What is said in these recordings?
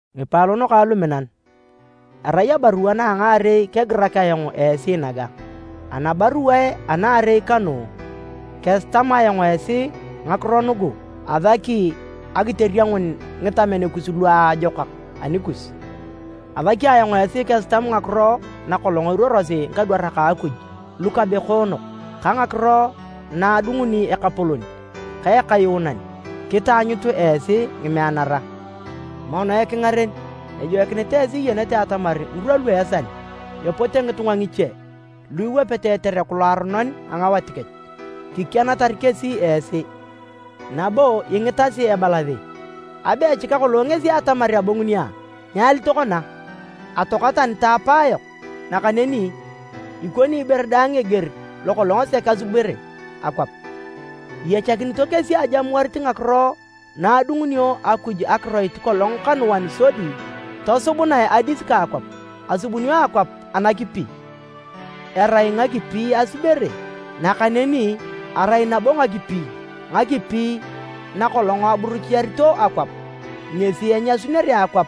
Ngipaalon kang luminan, erai abarua na a ngaarei kegirak ayong esi naga. Anabaruae anaarei kanu, kesitam ayong esi ngakiro nugu asaki akiteriengun ngitamen luajokak anikus. Asaki ayong esi kitamut ngakiro na kolong eruorosi ngikadwarak a Akuj lukabekoonok, ka ngakiro na adunguni Ekapolon ka Ekayuunan, kitaanyut esi ngimeanara. Mono ekingaren, ejoikinit esi iyenete atamar ngirwa lu esal, epote ngitunga ngiche lu iwapete etereku loaronon a ngawat kech. Kikianatar kesi esi nabo ingitasi ebalasi, “Abe echika kolong ngesi atamar abonguni a? Nyali tokona? Atoaka tani ta apayok, nakaneni ikoni ibore daang eger lo kolong sek asubere akwap!” Iyachakinito kesi ajamuarit ngakiro na adungunio Akuj akiroit kolong kanuan sodi tosubunae adis ka akwap. Asubunio akwap anakipi, erai ngakipi asubere, nakaneni erai nabo ngakipi, ngakipi na kolong aburuchiarito akwap, ngesi enyasunere akwap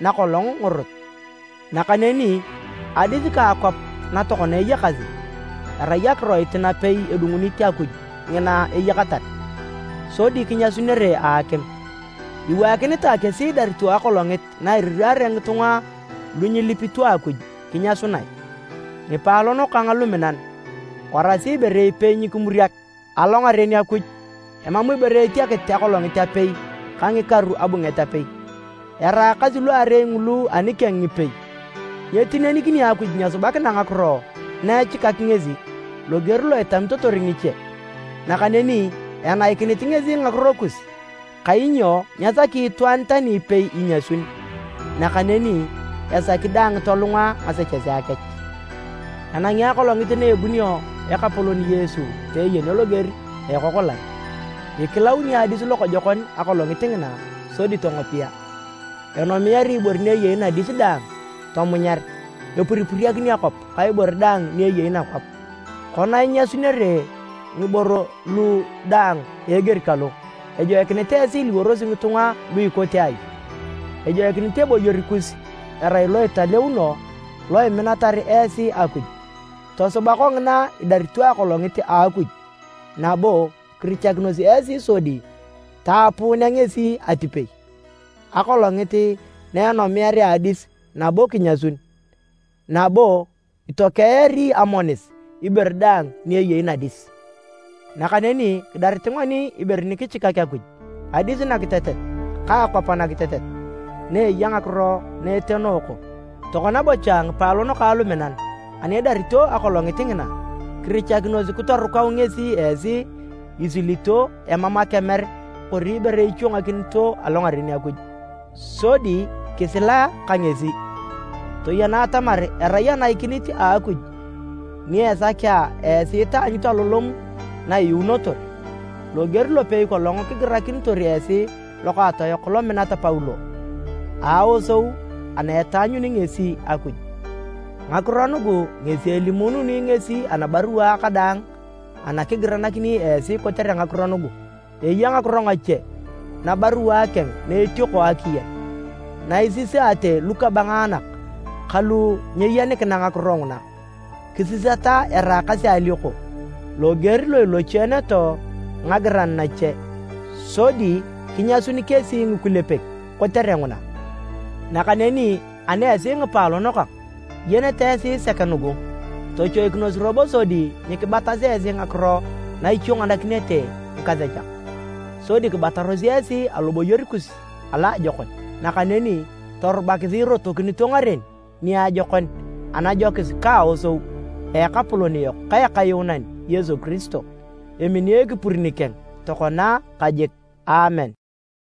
na kolong ngorot. Nakaneni adis ka akwap na tokona eyakasi, erai akiroit napei edungunit Akuj ngina eyakatar, sodi kinyasunere a akim. Iwaakinitae kesi idarito akolongit na iriraare ngitunga lu nyilipito Akuj kinyasunae. Ngipaalon kang luminan, warasi ibore ipei nyikimuriak! Alongaren Akuj, emam ibore etiakit akolongit apei ka ngikaru abunget apei, eraakasi luarei ngulu anikeng ngipei. Nyetinenikini Akuj nyesubakina ngakiro na echikak ngesi, loger lo itamitotor ngiche. Nakaneni enaikinit ngesi ngakiro kus kainyo nyesaki itwaan tani ipei inyasun, nakaneni esaki daang tolunga ngasechesea kech. Enangi Akolongit na ebunio Ekapolon Yesu peeyenio loger a ekokolan. Ikilauni adis lokojokon Akolongit ngina sodi tongopia. Enomiari ibore ni eyei nadis daang tomunyar. Epuripuriakin akwap ka ibore daang ni eyei nakwap. Kona inyasunere ngiboro lugu daang a eger kalo, ejoikinit esi iliworosi ngitunga lu ikote ai? Ejoikinit eboyor kus erai lo italeuno lo iminatar esi Akuj. Tosuba kongina idarito Akolongit a Akuj nabo kirichakinos esi sodi taapuunea ngesi atipei, Akolongit na enomiarea adis nabo kinyasun, nabo itokeari amonis ibore daang ni eyei nadis. Nakaneni kidarit ngoni ibore ni kichikak Akuj, adis nakitetet ka akwap nakitetet na eya ngakiro na etenooko. Tokona bocha ngipaalon kang luminan, ani idarito akolongit ngina, kirichakinos kitorukau ngesi esi isilito, emam akemer kori ibore ichwangakinito alongaren Akuj, sodi kisila ka ngesi. Toyena atamar erai anaikinit a Akuj ni esakea esi taanyut alolom na iyuunotor, loger lopei kolong kigirakinitor esi lokaatoyok lominat Paulo, a aosou ana etaanyuni ngesi Akuj. Ngakiro nugu ngesi elimuununi ngesi anabaruae kadaang ana kigiranakini esi kotere ngakiro nugu. Eya ngakiro ngache nabaruae keng na etiono akiyen na isisaate lukabangaanak ka lu nyeyenikina ngakiro nguna, kisisata eraakasi alioko, loger lo ilochieneto ngagiran nache. Sodi kinyasun kesi ngikulepek kotere nguna. Nakaneni ani esi ngipaalon kang, iyenete esi sek nugu. Tochoikinos robo sodi nyikibatasi esi ngakiro na ichwanganakinete ngikasechak, sodi kibataros esi aloboyor kus aloajokon. Nakaneni torubakisi irotokinito ngaren niajokon anajokis ka aosou a Ekapolon yok ka Ekayuunan Yesu Kiristo. Emini ekipur nikeng tokona ka jik! Aamen.